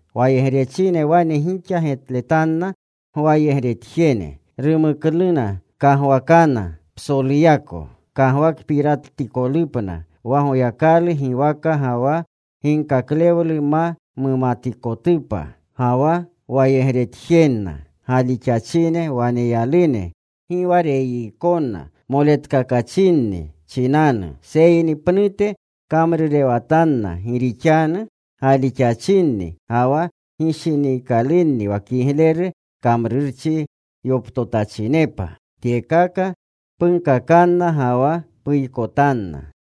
Wayegrechine wane gixa getletanna gwayegretjene: Rumuknuna kagwaakana psoluyako kagwakpiratikolupna, wa Goykalu giwaka ga wa ginkaklewlu ma mapatikotupa. Ga wa wayegretjenna galixachine waneyalune, gi wa reyiikona moletkakachinni chinanu, seyni pnute kamrurewatanna gi rixanu galixachinni ga wa gishiniikalunni wa kigleru kamrurchi yoptotachinepa. Tyekaka punkakanna ga wa puykotanna.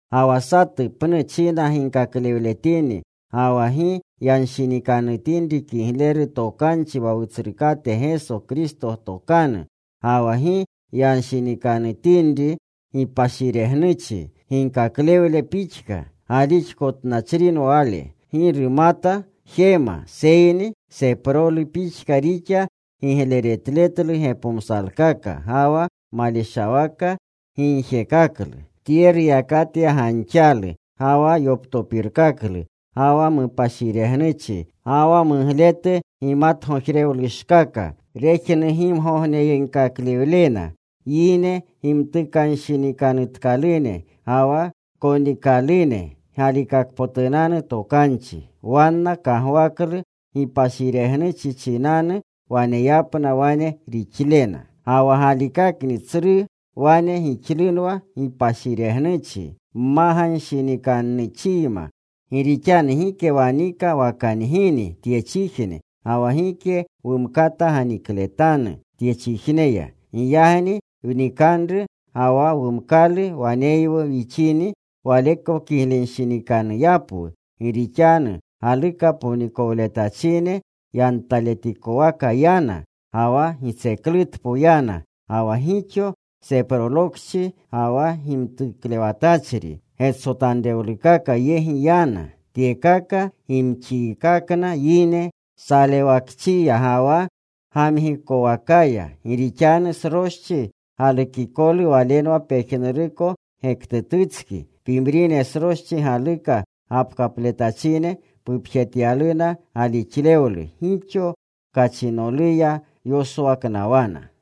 Ga wa satu pnu china ginkaklewletini ga wa gi yanshinikanutinri kigleru tokanchi wa Wutsrukate Geso Kristo tokanu, ga wa gi yanshinikanutinri gipashiregnuchi ginkaklewle pixka, galixkotnachrinwa wale. Gi rumata jema, seyni seprolu pixka rixa gigleretletlu gepomsalkaka ga wa maleshawaka gigjekaklu. Tye ruyakatya ganxalu, ga wa yoptopirkaklu, ga wa mupashiregnuchi, ga wa mugletu gimatgojrewlushkaka, rejnugimgogneyegkaklena yine gimtukanshinikanutkalune, ga wa konikalune galikakpotunanu tokanchi. Wanna kagwaklu gipashiregnuchi chinanu waneyapna wane rixlena. Ga wa galikakni tsru wane gixlunwa gipashiregnuchi mmaganshinikannuchiyma. Gi rixanu gike wanika wa kangini tyechijne, ga wa gike wumkata ganikletanu tyechijneya. Giyagni wnikanru ga wa wumkalu waneywu wchinini, waleko kiglenshinikanuyapwu. Gi rixanu galuka ponikowletachine yantaletikowaka yana, ga wa gitseklutpo yana, ga wa gixo seprolokchi ga wa gimtuklewatachri getsotanrewlukaka yegi yana. Tyekaka gimxiikakna yine salewakchiya ga wa gamgikowakaya. Gi rixanu sroschi galukikolu walenwa pejnuruko gektututski. Pimrine sroschi galuka gapkatletachine pupjetyaluna galixlewlu. Gixo kachinoluya yoswaknawana.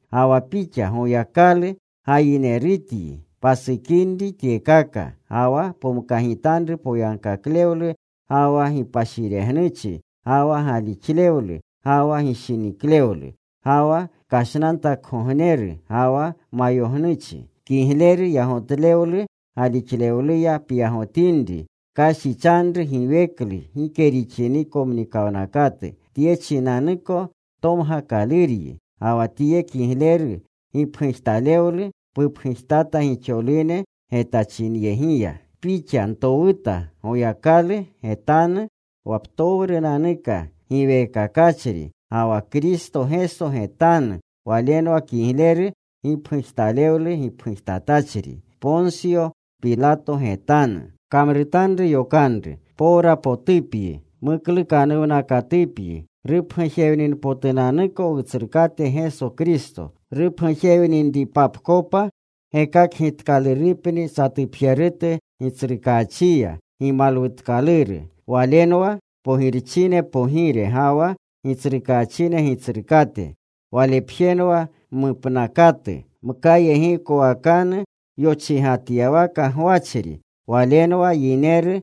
Ga wa pixa, Goyakalu gayinerutyi, pasukinri tyekaka. Ga wa pomkagitanru poyagkaklewlu, ga wa gipashiregnuchi, ga wa galixlewlu, ga wa gishiniklewlu, ga wa kashnantakgogneru, ga wa mayognuchi. Kigleru yagotlewlu galixlewluya pyagotinri. Pkashichanru giweklu gike rixiniko mnikawnakatu. Tye chinanuko tomgakaluryi. Ga wa tye kigleru gipgujtalewlu pupgujtata gixolune getachinyegiya. Pixa ntowuta Goyakalu getanu wa ptowrunanuka giweekakachri, ga wa Kristo Geso getanu. Walenwa kigleru gipgujtalewlu gipgujtatachri Ponsyo Pilato getanu. Pkamrutanru yokanru. Powrapotupyi. Muklukanuwnakatupyi rupgujewninpotunanuko Wutsrukate Geso Kristo. Rupgujewninripapkopa gekakgitkalurupni satupjerutu Gitsrukaachiya gimalwutkaluru. Walenwa pogirchine Pogire, ga wa gitsrukaachine Gitsrukate. Walepjenwa mupnakatu. Mkayegiikowakanu yochigatyawaka gwachri. Walenwa yineru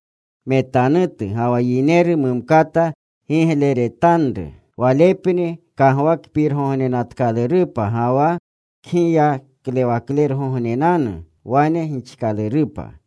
metanutu ga wa yineru mumkata getletanutu. Walepni kagwakpirgognenatkalurupa ga wa kgiyaklergognenanu. Wane gixkalurupa.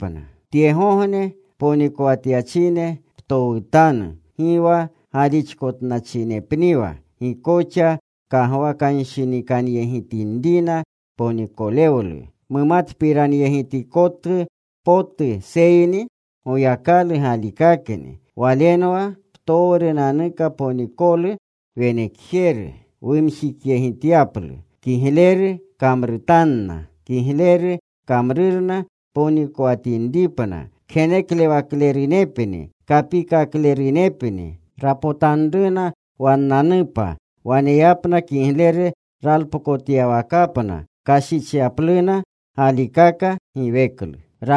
Tyegogne ponikowatyachine ptowutanu gi wa galixkotnachinepniwa. Gi koxa kagwakanshinikanyegitinrina ponikowlu mumatpiranyegitkotu potu, seyni Goyakalu galikakni. Walenwa ptowrunanuka ponikolu wenekjeru wumjikyegityaplu. Kigleru kamrutanna. Kigleru kamrurna ponikowatinripna. Kgenekaklerunepni. Kapikaklerunepni. Rapotanruna wannanupa waneyapna kigleru ralpokotyawakapna, kashichyapluna galikaka giweklu.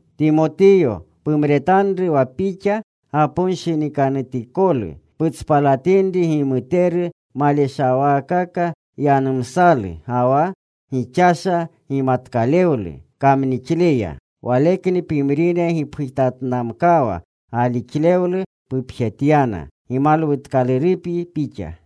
Timotiyo, pumretanru wa pixa gaponshinikanutikolu. Putspalatinri gimuteru maleshawaakaka yanumsalu, ga wa gixasha gimatkalewlu kamnixleya. Walekni pimrine gipgujtatnamkawa, galixlewlu pupjetyana. Gimutkalurupyi pixa.